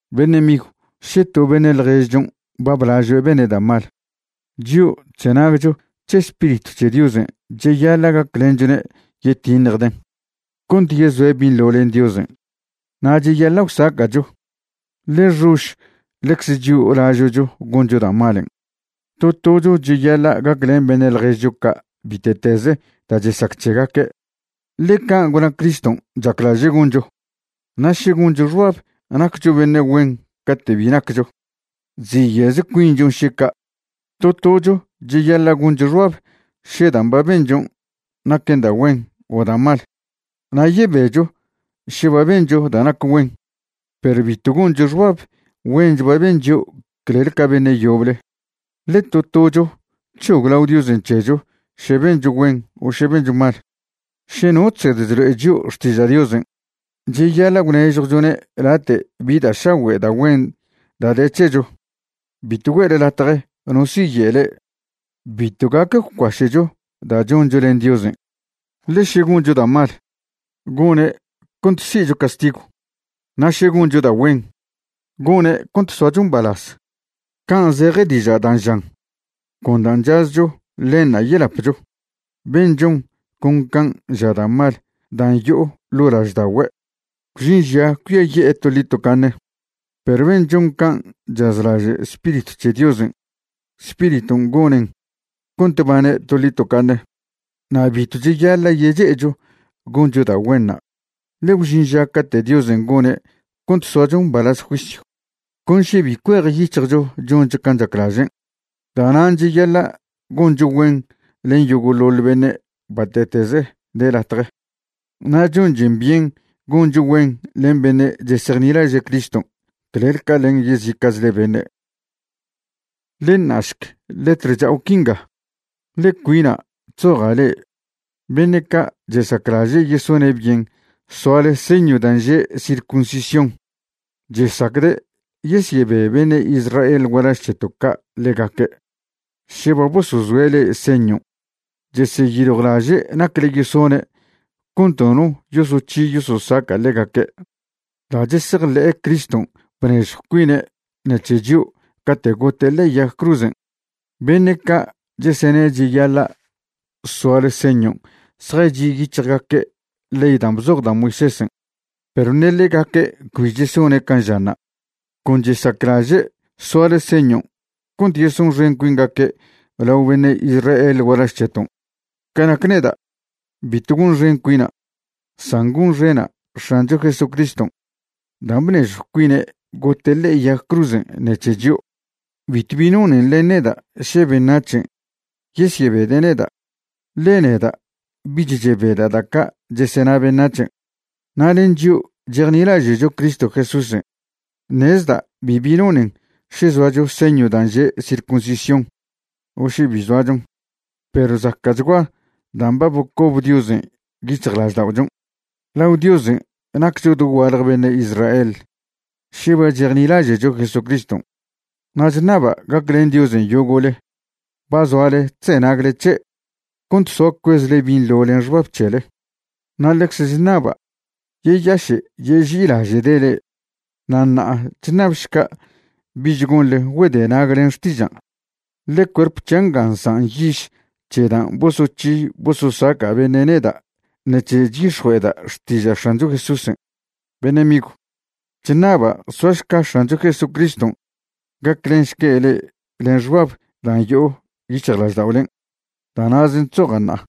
Beṉe' migw, še to beṉe' ḻježchon' ba blažoe' bene' da' mal, chio' chzenagcho c̱he Spiritw c̱he Diosen' cheyaḻa' gaclenchwne' yetiṉjden' cont yezoe' binḻo len Diosen'. Na' cheyaḻa' gwsaca'cho, ḻe xož ḻecze chio' lažo'cho goncho da' malen'. To tocho cheyaḻa' gaclen beṉe' ḻježcho ca' bite'teze da' chesac c̱hegaque', ḻe can' gwna Criston' chaclaže' goncho. Na' še goncho xbab naccho beṉe' güen cate' bi naccho, chziye'ze cuinchon' še ca'. To tocho cheyaḻa' goncho xbab še dan' ba benchon' naquen da' güen o da' mal. Na' yebecho še ba bencho da' nac güen, perw bitw goncho xbab güench ba ben chio' clel ca beṉe' yoble. Ḻe to tocho c̱hoglao Diosen' c̱hecho še bencho güen o še bencho mal. Še no chsed chlo'e chio' xtiža' Diosen', cheyaḻa' gwnežjwchone' late' bi da' šagüe' da' güen da' de c̱hecho. Bitw güe'le latje no si'ye' le'e, bitw gac gwcuaše'cho da' choncho len Diosen'. Ḻe še goncho da' mal, gone' cont si'cho castigw; na' še goncho da' güen, gone' cont soacho mbalaz. Can' zeje diža' dan' žan: “Con dan' chazcho, ḻenṉa' yelapcho.” Ben' chon con can' ža da' mal dan' yo'o ḻo' lažda'ogüe', gwžin ža cuiaye'e toḻi tocaṉe; perw ben' chon can' chazlaže' Spiritw c̱he Diosen', Spiriton' gonen cont bane' toḻi tocaṉe. Na' bitw cheyaḻa' yeche'echo goncho da' güenṉa', ḻe gwžin ža cate' Diosen' gone' cont soacho mbalaz juisyw, con še bi cuejyic̱hjcho choncho can' chaclažen'. Da'nan' cheyaḻa' goncho güen len yogo'ḻoḻ beṉe' bate'teze de latje, na' chonchen byen goncho güen len beṉe' chesejnilaže' Criston' clel ca len yezica'chle beṉe'. Ḻe ṉa'šc letr cha'o quinga, ḻe cuina' chzoja' le'e. Beṉe' ca' chesaclaže' yesone' byen soale señw dan' že' circuncisión chesacde' yesyebe beṉe' Israel gualaž c̱heto' ca' ḻegaque' še ba bosozoe' le'e señon'. Chesyeyiljwlaže' nacle yesone' cont nono yosoc̱hi yososaca' ḻegaque' da' chesejḻe'e Criston' bnežjw cuine' ṉec̱he chio' cate' gote' ḻe'e yag cruzen'. Beṉe' ca' chesene' cheyaḻa' soale señon' zjachi' yic̱hjgaque' ley dan' bzoj da' Moisésen' perw ṉe ḻegaque' cbi chesone' can' žanṉa'. Con chesaclaže' soale señon' cont yesonxen cuingaque' lao beṉe' Israel gualaž c̱heton'. Ca nac neda', bitw gonxen cuina', san gonxena' X̱ancho Jesucriston' dan' bnežjw cuine' gote' ḻe'e yag cruzen' ṉec̱he chio'. Bitwbi nonen len neda' še beṉac̱hen' yesyebede' neda', ḻe neda' bich chebeda' da' ca' chesena beṉac̱hen'. Na' len chio' chejnilaže'cho Cristo Jesúsen' ṉezda' bibi nonen še zoacho señw dan' že' circuncisión o še bi zoachon, perw zaca'chgua dan' ba bocob Diosen' yic̱hjlažda'ochon'. Lao Diosen' naccho doguaḻje beṉe' Israel še ba chejnilaže'cho Jesucriston'. Na' chṉaba' gaclen Diosen' yogo'le ba zoale chzenagle c̱he' cont soa cuezchle binḻo len xbab c̱hele, na' ḻecze chṉaba' yeyaše' yeži'ilaže'de' le'e. Na' ṉa'a chṉabšca' bich gonḻe güedenag len xtižan', ḻe cuerp c̱hia' nga nsan' yiž c̱he dan' bosoc̱hi bososaca' beṉe' neda' ṉec̱he chyix̱jue'eda' xtiža' X̱ancho Jesúsen'. Beṉe' migw, chṉaba' soašca X̱ancho Jesucriston' gaclenšque' le'e len xbab dan' yo'o yic̱hjlažda'olen'. Da' na'zen' chzoja' ṉa'a.